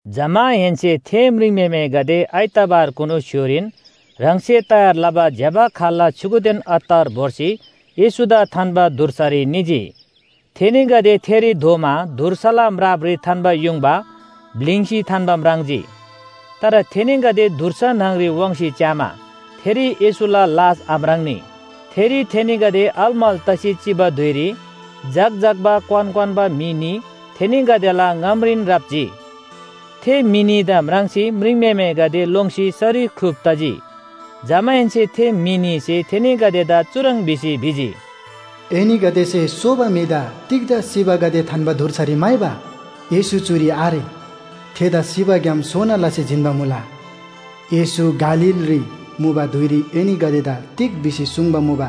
जमाहेन्‍से थे म्रिङम्‍हेमेगदे आइतवारकुनु स्‍य्‍होरीन ह्राङसे तयार लबा ज्‍यबा खाल्‍ला छ्‌युगुदेन अत्तर भोर्सी येशूदा थान्‍बा धुर्सारी निजी। थेनीगदे थेरी धोमा धुर्साला म्रापरी थान्‍बा युङबा ब्‍लिङ्सी थान्‍बा म्राङ्जी। तर थेनीगदे धुर्सा न्‍हङरी वाङ्सी च्‍यामा थेरी येशूला लास आम्राङ्‌नी। थेरी थेनीगदे अलमल तसी चिबा धुइरी झक्‍झक्‍बा क्‍वान क्‍वान्‍बा म्‍हि न्‍ही थेनीगदेला ङामरीन राप्‍जी। थे म्‍हि न्‍हीदा म्राङ्सी म्रिङम्‍हेमेगदे लोङ्सी सरी ख्‍लुप तजी। जमाहेन्‍से थे म्‍हि न्‍हीसे थेनीगदेदा चुह्रङ् भिसी भिजी, “एनीगदेसे सोबा म्‍हिदा तिग्‍दा सिबागदे थान्‍बा धुर्सारी म्‍हाइबा? येशू चुरी आरे। थेदा सिबाग्‍याम सोना लसी जिन्‍बा मुला! येशू गालीलरी मुबा धुइरी एनीगदेदा तिग भिसी सुङ्बा मुबा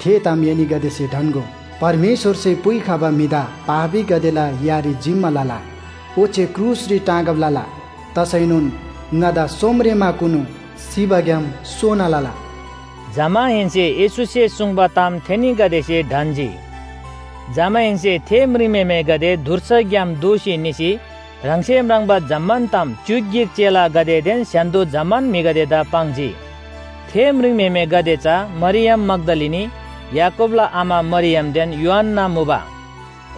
थे ताम एनीगदेसे ढन्‍गो। परमेश्‍वरसे पुइखबा म्‍हिदा पापीगदेला यारी जिम्‍मा लला, ओच्‍छे क्रुसरी टाँगब लला तसैनोन ङादा सोमरेमाकुनु सिबाग्‍याम सोना लला।” जमाहेन्‍से येशूसे सुङ्बा ताम थेनीगदेसे ढन्‍जी। जमाहेन्‍से थे म्रिङम्‍हेमेगदे धुर्साग्‍याम दोःसी निसी ह्राङसे म्राङ्बा जम्‍मान ताम च्‍युक गिक चेलागदेदेन स्‍य्‍हान्‍दो जम्‍मान म्‍हिगदेदा पाङ्जी। थे म्रिङम्‍हेमेगदे चा मरियम मग्‍दलिनी, याकूबला आमा मरियमदेन योअन्‍ना मुबा।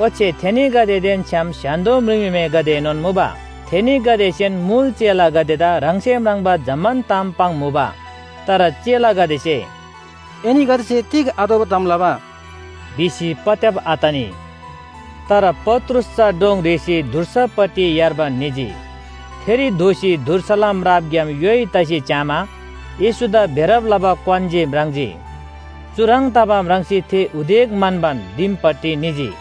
ओच्‍छे थेनीगदेदेन छ्‌याम स्‍य्‍हान्‍दो म्रिङम्‍हेमेगदेएनोन मुबा। थेनीगदेसेन मुल चेलागदेदा ह्राङसे म्राङ्बा जम्‍मान ताम पाङ्मुबा। तर चेलागदेसे “एनीगदेसे तिग आतोःबा ताम लबा?” भिसी पत्‍याब आतनी। तर पत्रुस चा डोङ रेःसी धुर्सापट्टि यार्बान निजी। थेरी धोसी धुर्साला म्रापग्‍याम योइ तसी च्‍यामा येशूदा बेरब लबा क्‍वान जे म्राङ्जी। चुह्रङ् तबा म्राङ्सी थे उदेक म्‍हन्‍बान दिमपट्टि निजी।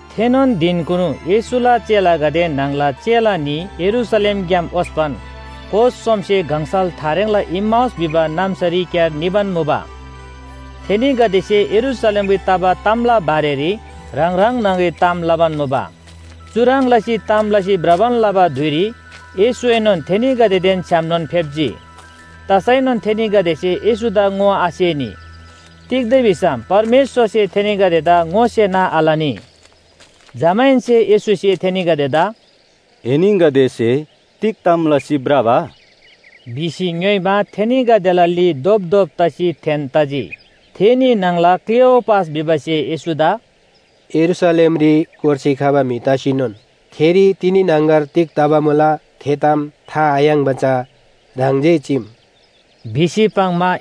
थेनोन धिनकुनु येशूला चेलागदे न्‍हङला चेला न्‍ही यरूशलेमग्‍याम ओस्‍पन कोस सोमसे गङसल थारेङला इम्‍माउस भिबा नाम्‍सारीक्‍यार निबान मुबा। थेनीगदेसे यरूशलेमरी तबा तामला बारेरी ह्राङ ह्राङ न्‍हङरी ताम लबान मुबा। चुह्रङ् लसी ताम लसी भ्रबान लबा धुइरी येशूएनोन थेनीगदेदेन छ्‌यामनोन फेप्‍जी। तसैनोन थेनीगदेसे येशूदा ङोआसेनी। तिग्‍दा भिसम परमेश्‍वरसे थेनीगदेदा ङोसेना आलनी। जमाहेन्‍से येशूसे थेनीगदेदा “एनीगदेसे तिग ताम लसी भ्रबा?” भिसी ङ्‌योइमा, थेनीगदेला ली धोपधोप लसी थेन तजी। थे न्‍ही न्‍हङला क्‍लेओपास भिबासे येशूदा “यरूशलेमरी कोर्सी खबा म्‍हि तसीनोन थेरी तिनी न्‍हङगर तिग तबा मुला थे ताम था आयाङ्बा चा ह्राङ जे चीम” भिसी पाङ्‌मा,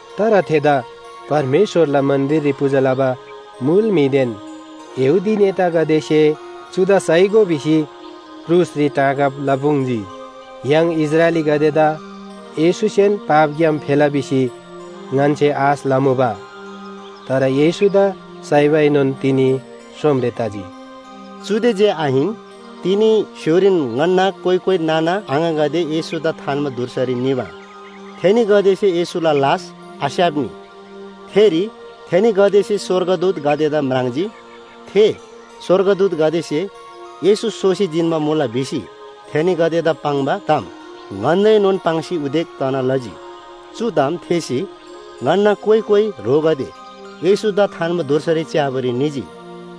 तर थेदा परमेश्‍वरला मन्‍दिररी पूजा लबा मुल म्‍हिदेन यहूदी नेतागदेसे चुदा साइगो भिसी क्रुसरी टाँगब लपुङ्जी। य्‍हाङ इस्राएलीगदेदा येशूसेन पापग्‍याम फेला भिसी ङन्‍से आश लमुबा। तर येशूदा साइबाएनोन तिनी सोमरे तजी। चुदे जे आहिन, तिनी स्‍य्‍होरीन ङन्‍ना कोइ कोइ नाना आङागदे येशूदा थान्‍बा धुर्सारी निमा, थेनीगदेसे येशूला लास आस्‍याप्‍नी। थेरी थेनीगदेसे स्‍वर्गदूतगदेदा म्राङ्जी। थे स्‍वर्गदूतगदेसे “येशू सोसी जिन्‍बा मुला” भिसी थेनीगदेदा पाङ्बा ताम ङन्‍दाएनोन पाङ्सी उदेक तना लजी। चु ताम थेःसी ङन्‍ना कोइ कोइ ह्रोगदे येशूदा थान्‍बा धुर्सारी च्‍याबारी निजी।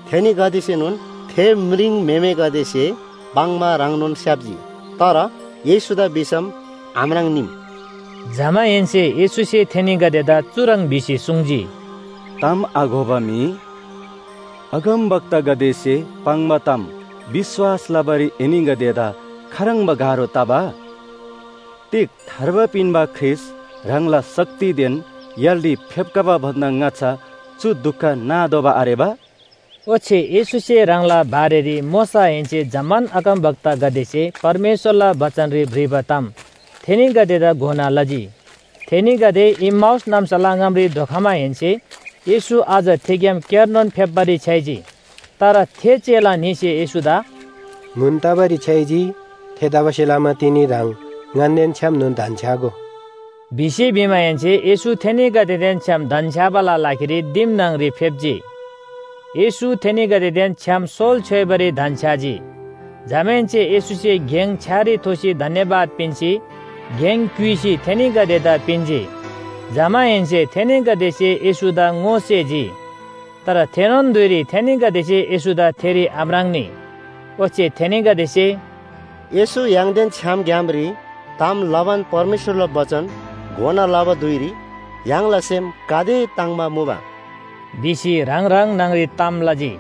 थेनीगदेसेएनोन थे म्रिङम्‍हेमेगदेसे पाङ्बा ह्रङ्नोन स्‍याप्‍जी, तर येशूदा भिसम आम्राङ्नीम।” जमाहेन्‍से येशूसे थेनीगदेदा चुह्रङ् भिसी सुङ्जी, “ताम आघोबा म्‍हि, अगमवक्तागदेसे पाङ्बा ताम विश्‍वास लबारी एनीगदेदा खाह्रङ्बा गाह्रो तबा? तिग थार्बा पिन्‍बा ख्रीष्‍ट ह्राङला शक्तिदेन य्‍हालरी फेप्‍खबा भन्‍दा ङाच्‍छा चु दुख नातोःबा आरेबा?” ओच्‍छे येशूसे ह्राङला बारेरी मोशाहेन्‍से जम्‍मान अगमवक्तागदेसे परमेश्‍वरला बचनरी भ्रिबा ताम थेनीगदेदा घोना लजी। थेनीगदे इम्‍माउस नाम्‍साला ङामरी धोखमाहेन्‍से येशू अझ थेग्‍याम क्‍यारनोन फेप्‍बारी छ्‌याइजी। तर थे चेला न्‍हीसे येशूदा “म्‍हुन तबारी छ्‌याइजी, थेतबासेलमा तिनी ह्राङ ङन्‍देन छ्‌यामनोन धन्‍छ्‌यागो” भिसी भिमाहेन्‍से येशू थेनीगदेदेन छ्‌याम धन्‍छ्‌याबाला लागिरी दिम न्‍हङरी फेप्‍जी। येशू थेनीगदेदेन छ्‌याम सोल छ्‌योइबारी धन्‍छ्‌याजी। जमाहेन्‍से येशूसे गेङ छ्‌यारी थोसी धन्‍यवाद पिन्‍सी गेङ क्‍युइसी थेनीगदेदा पिन्‍जी। जमाहेन्‍से थेनीगदेसे येशूदा ङोसेजी। तर थेनोन धुइरी थेनीगदेसे येशूदा थेरी आम्राङ्‌नी। ओच्‍छे थेनीगदेसे “येशू य्‍हाङदेन छ्‌याम ग्‍यामरी ताम लबान परमेश्‍वरला बचन घोना लबा धुइरी य्‍हाङला सेम गाते ताङ्‍बा मुबा” भिसी ह्राङ ह्राङ न्‍हङरी ताम लजी।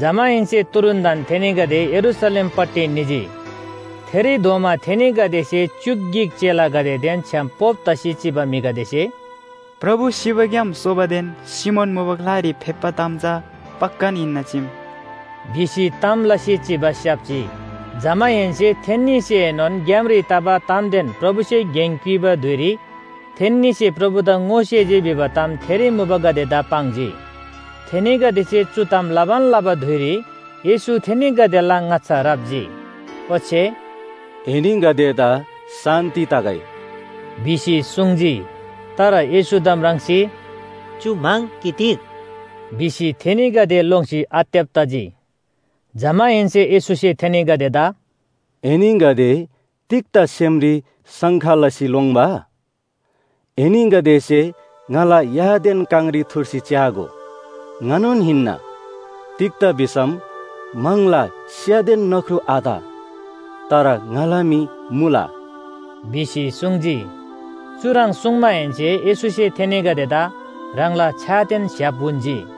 जमाहेन्‍से तुरुन्‍तन थेनीगदे यरूशलेमपट्टि निजी। थेरी धोमा थेनीगदेसे च्‍युक गिक चेलागदेदेन छ्‌याम पोप तसी चिबा म्‍हिगदेसे, “प्रभु सिबाग्‍याम सोबादेन सिमोन मुबा ग्‍लारी फेप्‍बा ताम चा पक्‍कान हिन्‍ना चीम” भिसी ताम लसी चिबा स्‍याप्‍जी। जमाहेन्‍से थेन्‍नीसेएनोन ग्‍यामरी तबा तामदेन प्रभुसे गेङ क्‍युइबा धुइरी थेन्‍नीसे प्रभुदा ङोसेजी भिबा ताम थेरी मुबागदेदा पाङ्जी। थेनीगदेसे चु ताम लबान लबा धुइरी येशू थेनीगदेला ङाच्‍छा राप्‍जी, ओच्‍छे “एनीगदेदा शान्‍ति तगै” भिसी सुङ्जी। तर येशूदा म्राङ्सी, “चु म्‍हङ कि तिग” भिसी थेनीगदे लोङ्सी आत्‍यब तजी। जमाहेन्‍से येशूसे थेनीगदेदा “एनीगदे तिग्‍दा सेमरी शङ्का लसी लोङ्‌बा? एनीगदेसे ङाला यादेन काङरी थुर्सी च्‍यागो, ङानोन हिन्‍ना। तिग्‍दा भिसम म्‍हङला स्‍यादेन नख्रु आत, तर ङाला मी मुला” भिसी सुङ्जी। चुह्रङ् सुङ्माहेन्‍से येशूसे थेनीगदेदा ह्राङला छ्‍यादेन स्‍य्‍हाप उन्‍जी।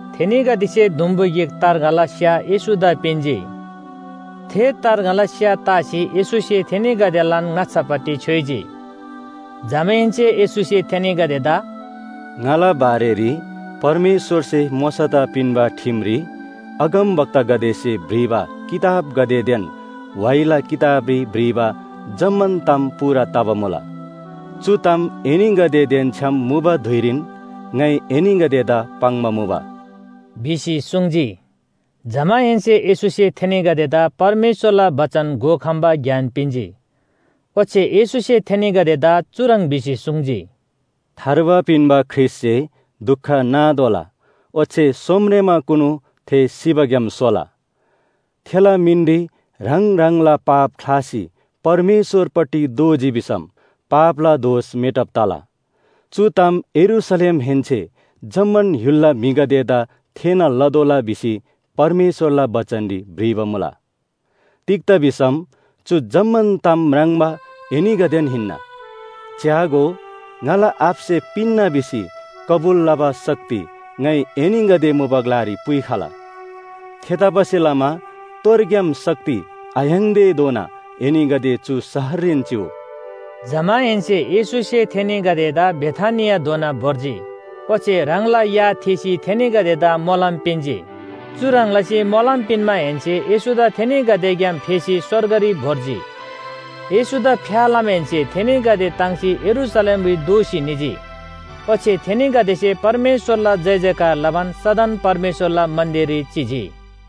थेनीगदेसे दुम्‍बु गिक तार्ङाला स्‍या येशूदा पिन्‍जी। थे तार्ङाला स्‍या तासी येशूसे थेनीगदेलान ङाच्‍छापट्टि छ्‌योइजी। जमाहेन्‍से येशूसे थेनीगदेदा “ङाला बारेरी परमेश्‍वरसे मोशादा पिन्‍बा ठिमरी, अगमवक्तागदेसे भ्रिबा किताबगदेदेन व्‍हाइला किताबरी भ्रिबा जम्‍मान ताम पूरा तबा मुला। चु ताम एनीगदेदेन छ्‌याम मुबा धुइरीन ङाइ एनीगदेदा पाङ्बा मुबा” भिसी सुङ्जी। जमाहेन्‍से येशूसे थेनीगदेदा परमेश्‍वरला बचन घोखम्‍बा ज्ञान पिन्‍जी। ओच्‍छे येशूसे थेनीगदेदा चुह्रङ् भिसी सुङ्जी, “थार्बा पिन्‍बा ख्रीष्‍टसे दुख नातोःला ओच्‍छे सोमरेमाकुनु थे सिबाग्‍याम सोला, थेला मिनरी ह्राङ ह्राङला पाप ख्‍लासी परमेश्‍वरपट्टि दोःजी भिसम पापला दोष मेटब तला। चु ताम यरूशलेमहेन्‍से जम्‍मान य्‍हुलला म्‍हिगदेदा थेःना लतोःला भिसी परमेश्‍वरला बचनरी भ्रिबा मुला। तिग्‍दा भिसम चु जम्‍मान ताम म्राङ्बा एनीगदेन हिन्‍ना। च्‍यागो, ङाला आबासे पिन्‍ना भिसी कबुल लबा शक्ति ङाइ एनीगदे मुबा ग्‍लारी पुइखला। थेतबासेलमा तोरग्‍याम शक्ति आयाङ्‌तेधोना एनीगदे चु शहररीन चिउ।” जमाहेन्‍से येशूसे थेनीगदेदा बेथानियाधोना भोर्जी, ओच्‍छे ह्राङला या थीसी थेनीगदेदा मोलम पिन्‍जी। चुह्रङ् लसी मोलम पिन्‍माहेन्‍से येशूदा थेनीगदेग्‍याम फेसी स्‍वर्गरी भोर्जी। येशूदा फ्‍या लमाहेन्‍से थेनीगदे ताङ्सी यरूशलेमरी दोःसी निजी। ओच्‍छे थेनीगदेसे परमेश्‍वरला जयजयकार लबान सदन परमेश्‍वरला मन्‍दिररी चिजी।